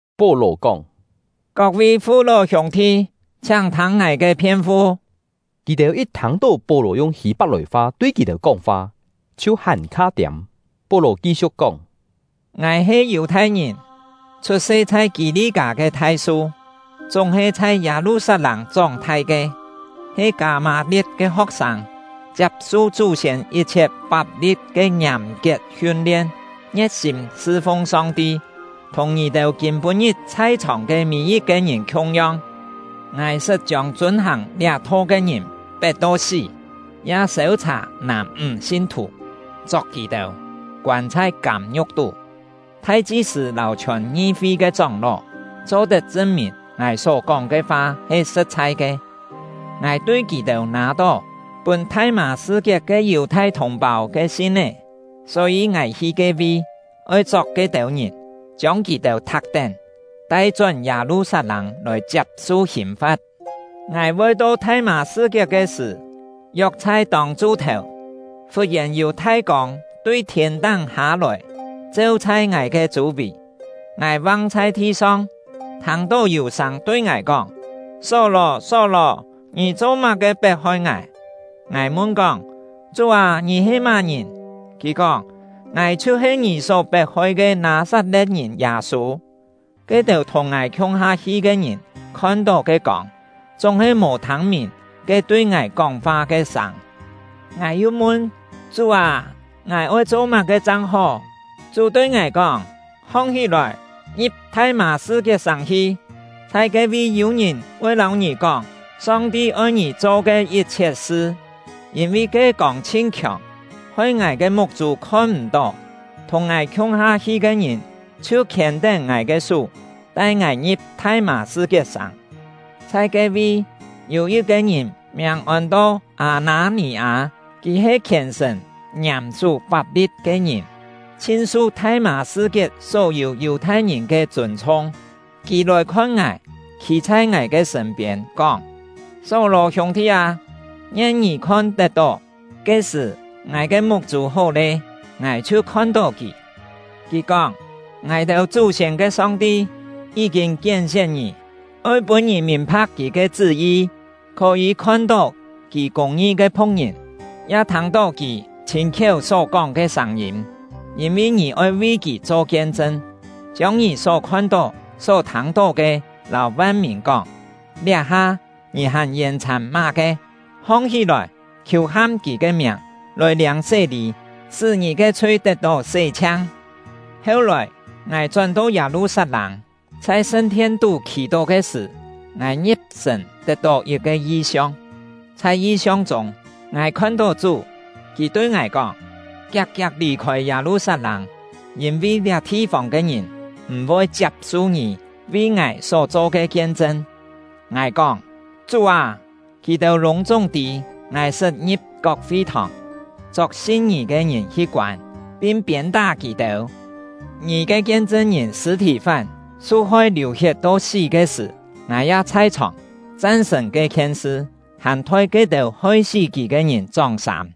Pó-lò kóng: “Kok-vi fu-ló hiûng-thi, chhiáng thâng ngài ke phien-fu.” Kì-têu yit thâng-tó Pó-lò yung Hî-pak-lòi-fa tui kì-têu kóng-fa, chhiu hàn-kha tiâm. Pó-lò ki-siu̍k kóng: “Ngài he Yù-thai-ngìn, chhut-se chhai Kî-li-kâ ke Thai-su, chúng-he chhai Yâ-lu-sat-lâng chóng-thai ke, he Kâ-mâ-lie̍t ke ho̍k-sâng, chiap-su chú-siên yit-chhiet fap-li̍t ke ngiàm-kiet hiun-lien, ngie̍t-sîm sṳ-fung Song-ti, thùng ngì-têu kîm-pû-ngit chhai-chhòng ke mî-yit-ke ngìn khiung-yong. Ngài sṳt chiông chûn-hàng liá Tho ke ngìn pet to sí, ya sêu-chhà nàm-ńg sin-thù, chok kì-têu, koân chhai kâm-ngiu̍k tú. Thai-chi-sṳ̂ lâu chhiòn ngi-fi ke chóng-ló cho-tet chṳn-mìn ngài só-kóng ke fa he sṳ̍t-chhai ke. Ngài tui kì-têu nâ-tó pûn Thai-mâ-sṳ-kiet ke Yù-thai thùng-pâu ke sin-é, só-yî ngài hi ke-vi, oi chok ke-têu ngìn, chiông kì-têu thak-tén, tai-chón Yâ-lu-sat-lâng lòi chiap-su hìn-fa̍t. “Ngài voi to Thai-mâ-sṳ-kiet ke sṳ̀, yok chhai tông-chu-thèu, fut-yèn yû thai kông tui thiên-táng hâ-lòi, cheu chhai ngài ke chû-vì. Ngài vang chhai thi-song, thâng-tó yû sâng tui ngài kóng: ‘Só-lò, Só-lò! Ngì cho-má-ke pet-hoi ngài?’ Ngài mun-kóng: ‘Chú â, ngì he má-ngìn?’ Kì kóng: ‘Ngài chhiu-he ngì só pet-hoi ke Nâ-sat-le̍t-ngìn Yâ-sû.’ Ke-têu thùng ngài khiung-ha hi ke ngìn khon-tó ke kông, chúng-he mò thâng-mìn ke tui ngài kóng-fa ke sâng. Ngài yu mun: ‘Chú â, ngài oi cho má-ke chang hó?’ Chú tui ngài kóng: ‘Hong-hí-lòi, ngi̍p Thai-mâ-sṳ-kiet-sàng hi, chhai ke-vi yû-ngìn voi lâu ngì kóng Song-ti oi ngì cho ke yit-chhiet sṳ.’ Yîn-vi ke kông chhin khiòng, hoi ngài ke muk-chû khon-m̀-tó, thùng ngài khiung-ha hi ke ngìn chhiu khiên-tén ngài ke sú, tai ngài ngi̍p Thai-mâ-sṳ-kiet-sàng. “Chhai ke-vi, yû yit-ke ngìn miàng ôn-to Â-nâ-nì-â. Kì he khièn-sṳ̀n, ngiàm-sú fap-li̍t ke ngìn, chhin su Thai-mâ-sṳ-kiet só-yû Yù-thai-ngìn ke chûn-chhung. Kì lòi khon ngài, khî chhai ngài ke sṳ̂n-piên, kóng: ‘Só-lò hiûng-thi â, ngien ngì khon-tet-tó!’ Ke-sṳ̀, ngài ke muk-chû hó lé, ngài chhiu khon-tó kì. Kì kóng: ‘Ngài-têu chú-siên ke Song-ti yí-kîn kién-sién ngì, oi pûn ngì mìn-pha̍k Kì ke chṳ́-yi, khó-yî khon-tó Kì kûng-ngi ke Phu̍k-ngìn, ya thâng-tó Kì chhîn-khiéu só-kóng ke sâng-yîm. Yîn-vi ngì oi vi Kì cho kien-chṳn, chiông ngì só khon-tó só thâng-tó ke lâu van-mìn kóng. Liá-ha, ngì hàn yèn-chhàn má-ke? Hong-hí-lòi, khiù-ham Kì ke miàng, lòi liâng sé-lî, sṳ́ ngì ke chhui tet-tó sé-chhiang!’ “Heu-lòi, ngài chón-to Yâ-lu-sat-lâng; chhai sṳn-thien-tú khì-tó ke sṳ̀, ngài ngi̍p-sṳ̀n tet-tó yit-ke yi-siong, chhai yi-siong chûng, ngài khon-tó Chú. Kì tui ngài kóng: ‘Kiak-kiak lì-khôi Yâ-lu-sat-lâng, yîn-vi liá thi-fông ke ngìn m̀-voi chiap-su ngì vi Ngài só-cho ke kien-chṳn.’ Ngài kóng: ‘Chú â, kì-têu lûng-chúng tî ngài sṳt ngi̍p kok fi-thòng, chok sin Ngì ke ngìn hi koân, pin piên-tá kì-têu. Ngì ke kien-chṳn-ngìn Sṳ̂-thì-fán su-hoi liù-hiet to sí ke sṳ̀, ngài ya chhai-chhòng, chan-sṳ̀n ke-khien sṳ, hàn thoi ke-têu hoi-sí kì ke ngìn chóng-sâm.’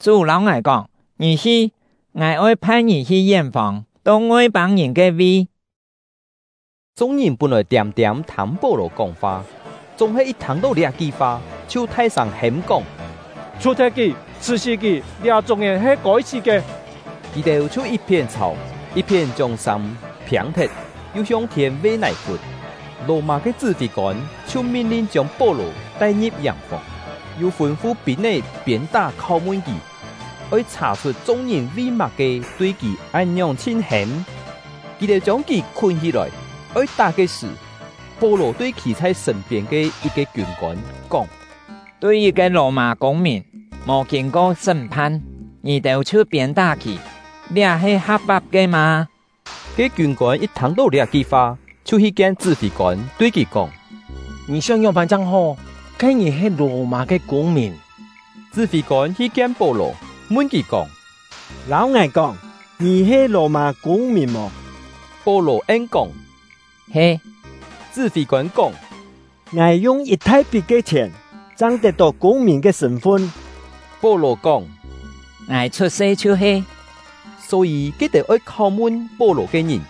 Chú lâu ngài kóng: ‘Ngì hi! Ngài oi phai ngì hi yén-fông, to Ngoi-pâng-ngìn ke-vi.’” Chung-ngìn pún-lòi tiâm-tiâm thâng Pó-lò kóng-fa; chúng-he yit thâng-tó liá-ki fa, chhiu thai-sâng hêm-kóng: “Chhù-thet kì! Chhṳ̀-sí kì! Liá-chúng ngìn he kôi-sí ke!” Kì-têu chhiu yit-phién chhàu, yit-phién chiông sâm phiâng-thet, yu hiong thiên ve nài-fún. Lò-mâ ke chṳ́-fî-kôn chhiu min-lin chiông Pó-lò tai-ngi̍p yàng-fòng, yu fûn-fu pîn-é piên-tá kháu-mun kì, oi chhà-chhut chung-ngìn vi má-ke tui kì án-ngiòng chhin hêm. Kì-têu chiông kì khún hí-lòi oi tá ke sṳ̀, Pó-lò tui khî chhai sṳ̂n-piên ke yit-ke kiûn-kôn kóng: “Tui yit-ke Lò-mâ kûng-mìn, mò kîn-ko sṳ́m-phan, ngì-têu chhiu piên-tá kì, liá he ha̍p-fap ke mâ?” Ke kiûn-kôn yit thâng-tó liá-ki fa, chhiu hi kien chṳ́-fî-kôn, tui kì kóng: “Ngì sióng ngióng-pân chang hó? Ke ngìn he Lò-mâ ke kûng-mìn!” Chṳ́-fî-kôn hi kien Pó-lò, mun kì kóng: “Lâu ngài kóng, ngì he Lò-mâ kûng-mìn mò?” Pó-lò en-kóng: “He.” Chṳ́-fî-kôn kóng: “Ngài yung yit thai-pit ke chhièn, chang tet-tó kûng-mìn ke sṳ̂n-fun.” Pó-lò kóng: “Ngài chhut-se chhiu-he.” Só-yî, ke-têu oi kháu-mun Pó-lò ke ngìn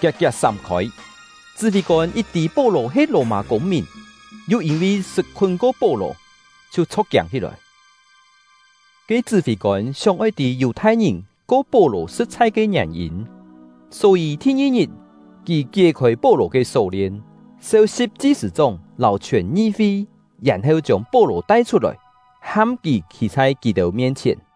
kiak-kiak sám-khôi; chṳ́-fî-kôn yit tî Pó-lò he Lò-mâ kûng-mìn, yu yîn-vi sṳt khún-ko Pó-lò, chhiu chho̍k-kiâng hí-lòi. Ke chṳ́-fî-kôn sióng-oi tî Yù-thai-ngìn ko Pó-lò sṳ̍t-chhai ke ngièn-yîn, só-yî, thi-ngi-ngit, kì kié-khôi Pó-lò ke só-lien, seu-si̍p chi-sṳ̂-chóng lâu chhiòn ngi-fi, yèn-heu chiông Pó-lò tai-chhut-lòi, ham kì khî chhai kì-têu mien-chhièn.